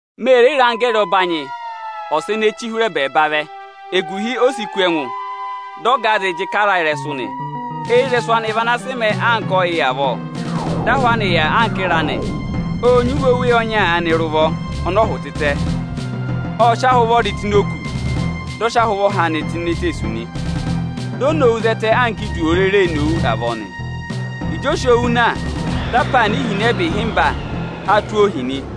Me re re anggẹẹrị ọbanyị ọsa ene ee chii hụrẹ ẹbẹẹba vẹ. Eguhi o si kú ẹngụ, dị ọgaazị jị karaa ịrẹsụ nị. Eyirẹsụ anị vị ana a sị mẹẹ anka ọyị avọọ, dị ahụ anị yà anka ịra nị. Ộ nyị iwe oweyi ọnya aanị rị ụvọ ọnị ọ hụ̀ tịtẹ. Ộ sị ahị ụvọrị tụ́ ini òkū, dị ọ sị ahụ ụvọha anị tụ́ ini eteesu nị. Di o nowu zẹtẹ anka idu òo rere ee nowu avọọ nị. Ịjị o si owu na, dị apaana ihinẹba sụ́ ịrẹyị ụpẹ ịhịmba tụ́ ọọ ohi nị.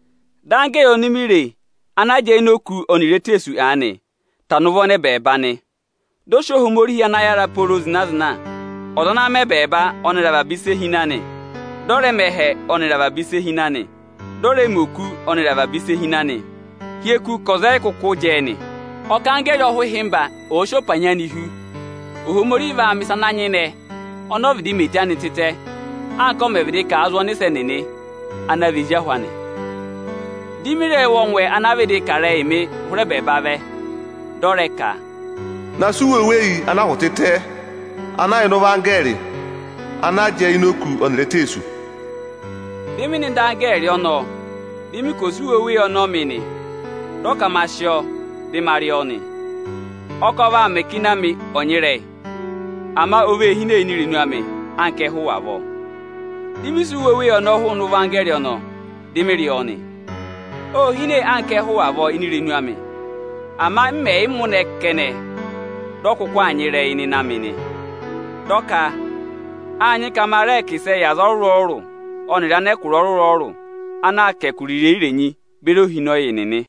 Dị anggẹẹrị oni mi re ana jẹẹ ini òkū ọnịrị eteesu aanị, tana ụvọ nọ ẹbẹẹba nị. Ộ sị Ohomorihi ana yára pooro zịna-zịna, ana mẹ ẹbẹẹba ọnịrị avaba ịsị e hi ịnị anị, dị ọ rẹ mẹ ẹhẹ ọnịrị avaba ịsị e hi ịnị anị, dị ọ rẹ mẹ oku ọnịrị avaba ịsị e hi ịnị anị hị́ eku ka ọza ọ yị kụkụ vaa za a kù nị. Ọ kà anggẹẹrị ọhụhịmba ọ̀ọ sị ọpanyị anị hú, Ohomorihi vaa mẹ̀ ịsa ana nyịnẹ ọnị ọ vịdị mẹ eto anị tịtẹ, anka ọ mẹ̀ vịdị kà a zụ ọnịsẹ nịnị ana vị ezi ahụ anị. —3.3Dị mị rẹ wụ ọngwẹ ana vịdị kà ịrẹyịị mị hụrẹ ẹbẹẹba vẹ, dị ọ rẹ ka: Ma na sị iwe oweyi ana a hụ̀ tịtẹ, ana yà ịnị ụvọ anggẹẹrị ana jẹẹ ini òkū ọnịrị eteesu nị. Dị mị nọ ịdị anggẹẹrị ọnọọ, dị mị ka ọ̀ sị iwe oweyi ọnọọ mị nị. Dị ọ ma sị ọọ dị ma rị ọọ nị. Ọ kà ọ vaa mẹ ka ịnị amị ọ̀ nyịrẹyị ama o vee hine ini irenu amị anka ẹhụ avọọ. Dị mị sị iwe oweyi ọnọọ hụụnị ụvọ anggẹẹrị ọnọọ, dị mị rị ọọ nị. Ô hine anka ẹhụ avọọ ini irenu amị. Ama m mẹ̀ yị mụnẹ ẹ kẹnẹ, dị ọ kụkụ aa nyịrẹyị ịnị ịnẹ amị nị. Dị ọ ka, â nyị ka ma rẹẹ kà ịsẹẹ yị aza ọrụrụ-ọrụrụ ọnịrị anẹkụra ọrụrụ-ọrụrụ ana aa kà ẹkụra irenyi-irenyi, beri ohinọyị nịnị nị.